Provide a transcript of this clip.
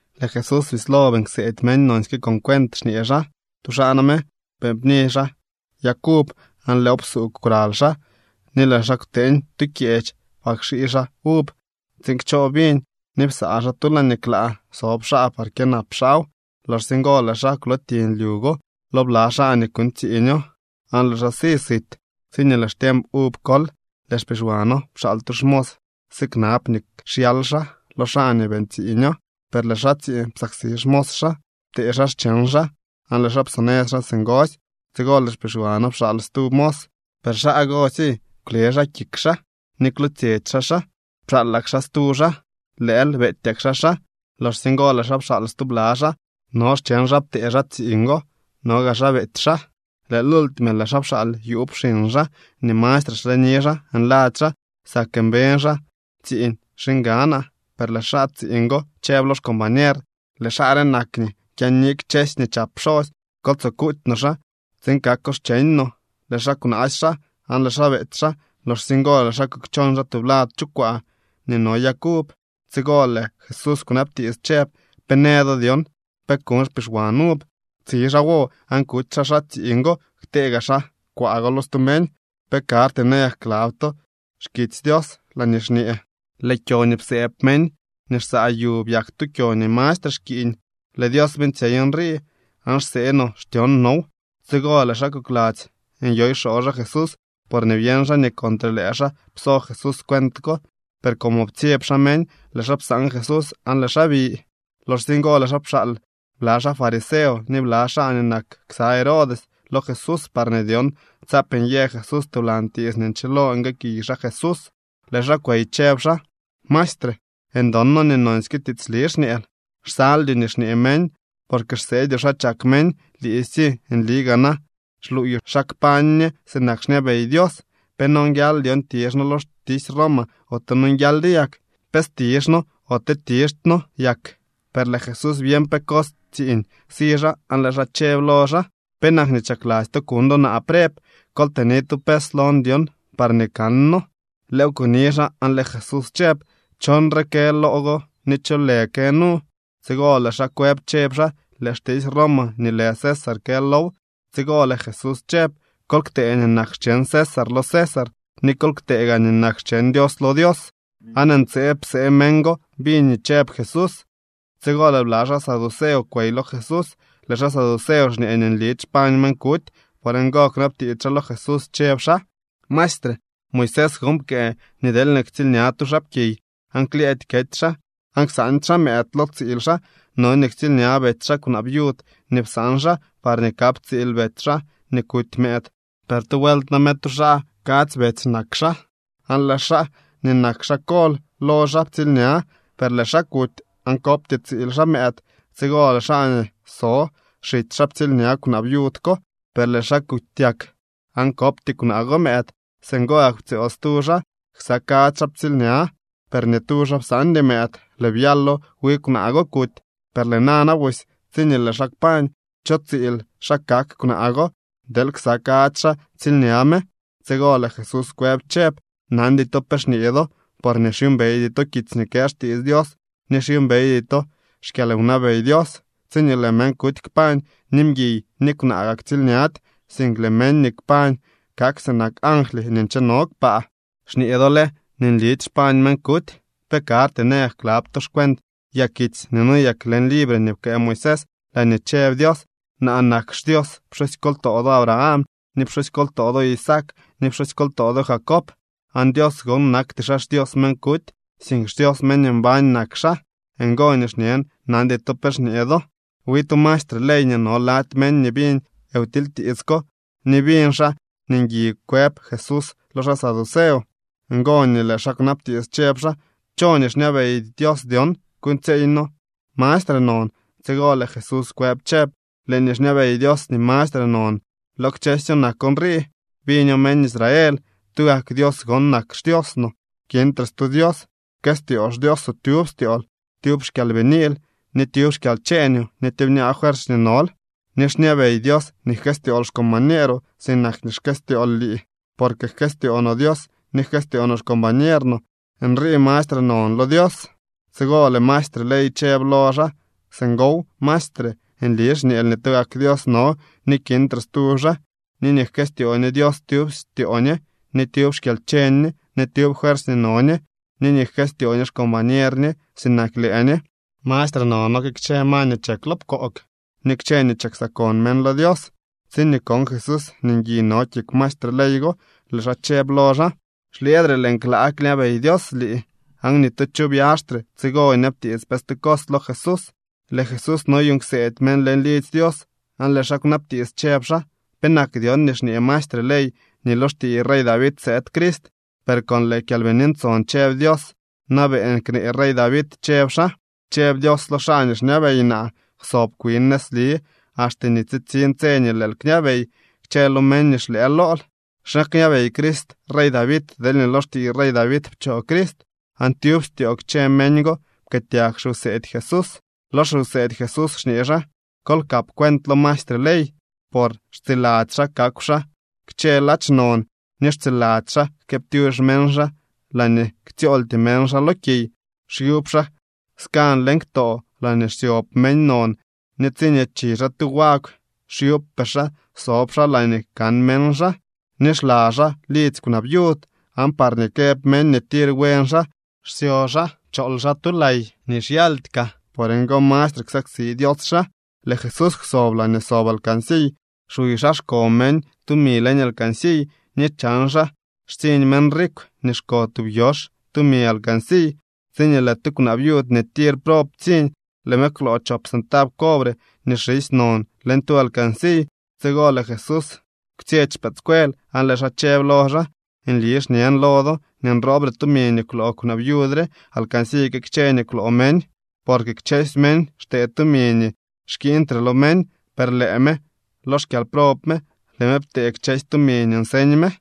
Lëë Jesús bislo beeñ kseedy meñ nonsyke con cuent xñee xaa: —Tu xaa name beeñ pni xaa yag uv aan lëëw psuugw kwraly xaa, ni lëë xaa kwteeñ tu kyeech par kxii xaa uv tsiin kchoo viñ ni psaa xaa tu laañee klaa sob xaa par kyënap xaaw. ’Loxsye ngo lëë xaa kwlootiñ lyu go lo bla xaa nii kuuñ xtsiiño aan lëë xaa si sit. Tsiñee lëë xtiemp uv kol, lëë xpixwano pxaal tu xmos siknab nii xyal xaa lo xaa nii beeñ tsiiño. Per lëë xaa tsiiñ psaksi xmos xaa, ptee xaa xcheñ xaa aan lëë xaa psonëz xaa singosy. Tsigo lëë xpixwano pxaal stu mos, per xaa gosy kwlë xaa kik xaa ni kwlootsyetsy xaa xaa. Pxaalak xaa stu xaa, lëël beetyak xaa xaa. Loxsye ngo lëë xaa pxaal stubla xaa. No cheñ xaa ptee xaa tsiiñ go, no gaa xaa beety xaa. ’Lëë lultime lëë xaa pxaal yuub xiñ xaa nii mastre xleni xaa nladzy xaa: “Sak mbeñ xaa tsiiñ xiñganaa.” Per lëë xaa tsiiñ go chëb lo xcombañer: “Lëë xaa re nak nii kyaani kchësy nii chap pxosy. Kol tsoo kuuty no xaa tsiin kako xcheñ no.” Lëë xaa kwnaasy xaa, aan lëë xaa beety xaa. Loxsye ngo lëë xaa kukchon xaa tublad chu kwaa nii no yag uv. Tsigo lëë Jesús kwnabtiits chëb: —¿Pe në do dyon pe kuñ xpixwan uv? Tsi xaa wo aan kuty xaa xaa tsiiñ go ktee gaa xaa kwaa go lo stu meñ. ’¿Pe karty nayak klab to xkitsy Dios laañee xñee: Lëë kyo nii psëëb meñ nii xsaa yu byak tu kyo nii mastre xkiiñ. Lëë Dios beeñtsyey nrii aan xsee no xtyon now? Tsigo lëë xaa kokladzy nyoy xoo xaa Jesús porñee byeñ xaa nii contre lëë xaa pso Jesús cuent ko. Per como ptsyeb xaa meñ, lëë xaa psaan Jesús aan lëë xaa bi. Loxsye ngo lëë xaa pxaal bla xaa fariseo ni bla xaa nii nak ksa Herodes lo Jesús parñee dyon tsaap nyë Jesús tublan tiits nii nchilo nguëëkiy xaa Jesús. Lëë xaa kwey chëb xaa: —Maestre, ndon noo nii nonsyke tiitsli xñeel, xsaldyoo nii xñee meñ porque xseedyoo xa chak meñ. Liisy nli gaa na xluuyoo xa kpañ ñe sinak xñabey Dios. ¿Pe nonguial dyon tizh noo lo xtisy Roma ote nonguialdyo yak? ¿Pe stizh noo ote tizhty noo yak? Per lëë Jesús byeñ pe cos tsiiñ si xaa aan lëë xaa chëb lo xaa: —¿Penak nii chakladzy to kuñ do naa preb? Kol tëni tu pes lon dyon parñee kanno. Lëëw kuni xaa aan lëë Jesús chëb: —¿Cho nrii kë loo go ni cho lë kë nu? Tsigo lëë xaa kwëb chëb xaa: —Lëë xtisy Roma nii lë César kë low. Tsigo lëë Jesús chëb: —Kol ktee nii nak xcheñ César lo César ni kol ktee gaa nii nak xcheñ Dios lo Dios. Aan ntseeb psee meñ go biñ nii chëb Jesús. Tsigo lëë bla xaa saduceo kwey lo Jesús. Lëë xaa saduceo xñee nii nlidy xpañ meñ kuty. Por ngo kunabtiits xaa lo Jesús chëb xaa: —Maestre, Moisés gon pkëë nii deelñee ktsiilña tu xaapkiy aan klyëëdy kety xaa aan ksaandy xaa mëëd lo tsiil xaa, no nii ktsiilña betsy xaa kwnaa viud nii psaan xaa parñee kap tsiil betsy xaa nii kuty mëëd. Per tu vuelt name tu xaa kadzy betsy nak xaa aan lëë xaa nii nak xaa kol lo xaa ptsiilña, per lëë xaa kuty aan kopty tsiil xaa mëëd. Tsigo lëë xaa nii so xitsy xaa ptsiilña kwnaa viud ko, per lëë xaa kutyak aan kopty kwnaa go mëëd. Singo gak ptsyool stu xaa. Ksa kadzy xaa ptsiilña, per ni tu xaa psaandy mëëd. Lëë byalo wi kwnaa go kuty. Per lëë nana busy tsiñee lëë xaa kpañ, ¿cho tsiil xaa kak kwnaa go deel ksa kadzy xaa ptsiilña me? Tsigo lëë Jesús kwëb chëb: —Nandy to pe xñee do, porñee xyuumbeydy to kitsy nii kë xtiits Dios ni xyuumbeydy to xkyalwnabey Dios. Tsiñee lëë meñ kuty kpañ, ni mguiy ni kwnaa gaa ktsiilñady, sink lëë meñ nii kpañ kak sinak angly nii ncheno kpaa. Xñee do lë nii nlidy xpañ meñ kuty. ¿Pe karty nayak klab to xcuent yakitsy nii noyek leñ libre nii pkëë Moisés laañee chëb Dios: “Naa nak xDios pxusykoltoo do Abraham, ni pxusykoltoo do Isaac ni pxusykoltoo do Jacob”? Aan Dios gon nakty xaa xDios meñ kuty, sink xDios meñ nii mbañ nak xaa. Ngo nii xñen nandy to pe xñee do. Wi tu maestre ley nii no lady meñ biñ wtilytiits ko, ni biñ xaa nii ngui kwëb Jesús lo xaa saduceo. Ngo nii lëë xaa kwnabtiits chëb xaa: —¿Cho nii xñabey Dios dyon kuuñtsyeey no mastre non? Tsigo lëë Jesús kwëb chëb: —Lëë nii xñabey Dios nii mastre non lo kchësyo nak nrii: “Biño meñ Israel, tugak Dios gon nak xDios no, kintre stu Dios. Pkëstyoo xDioosoo tyub styool, tyub xkyalbiniil, ni tyub xkyalcheeñoo ni tyubñaa fuersy nii nol.” Ni xñabey Dios nii jkëstyool xcombañeeroo sinak nii xkëstyool lii. Porque jkëstyoo no Dios ni jkëstyoo no xcombañer no, nrii mastre non lo Dios. Tsigo lëë maestre ley chëb lo xaa: —Singow, maestre. Nli xñeel nii tugak Dios no ni kintre stu xaa. Ni nii jkëstyoo ñe Dios tyub styoo ñe, ni tyub xkyalcheñ ñe, ni tyub fuersy nii no ñe, ni nii jkëstyoo ñe xcombañer ñe sinak lëë ñe, mastre nono que kchë ma nii chek lo pkoog ni kchë nii chiksakon meñ lo Dios. Tsiñee kon Jesús nii ngui no kik maestre ley go, lëë xaa chëb lo xaa: —Xlyëëdre lëë klaa kñabey Dios lii. Aan ni tu cho byaxtre tsigo nyabtiits pe stu cos lo Jesús. Lëë Jesús noyuuñ kseedy meñ leñ lidzy Dios aan lëë xaa kwnabtiits chëb xaa: —¿Penak dyon nii xñee maestre ley nii lo xtiiy rey David sëëd Crist? Per con lëë Kyalbini Ntson cheñ Dios na beeñ knee rey David chëb xaa: Chëb Dios lo xaa nii xñabey naa: “Kwsob kwin nëzli axte nii tsitsiñ tse nii lëël kñabey kchë lo meñ nii xlëë lool.” ¿Xa kñabey Crist rey David deelñee lo xtiiy rey David pchoo Crist? Aan tyub styoo kchësy meñ go pkëëtyag xiwseedy Jesús. Lo xiwseedy Jesús xñee xaa: —Kol kap cuent lo maestre ley, por xtsiladzy xaa kakw xaa kchë ladx non ni xtsiladzy xaa jkëëptyux meñ xaa laañee ktsyooltyee meñ xaa lo kiy. Xyub xaa skan leñ ktoo laañee xsyob meñ non ni tsiñee chi xaa tu wagw xyubpee xaa sob xaa laañee kan meñ xaa. Ni xla xaa lidzy kwnaa viud, aan parñee këb meñ nii tir buen xaa xsyo xaa chool xaa tu lay nii xyaldy kaa. Por ngo mastre ksaksi Dios xaa. Lëë Jesús kwsob laañee sob alcansiy xuy xaa xko meñ tumi leñ alcansiy ni chan xaa xtsiñ meñ rikw nii xko tub yox tumi leñ alcansiy. Tsiñee lëë tu kwnaa viud nii tir prob ptsiñ, lëë me kwloo chop centab cobre nii xisy non leñ tu alcansiy. Tsigo lëë Jesús kwtsyetsy xpëëdscuel aan lëë xaa chëb lo xaa: —Nli xñen lo do nii nroobre tumi nii kwloo kwnaa viud re alcansiy que kchë nii kwloo meñ. Porque kchësy meñ xtee tumi nii xkiiñtre lo meñ, per lëë me lo xkyalprob me, lëë me ptee kchësy tumi nii nseñ me.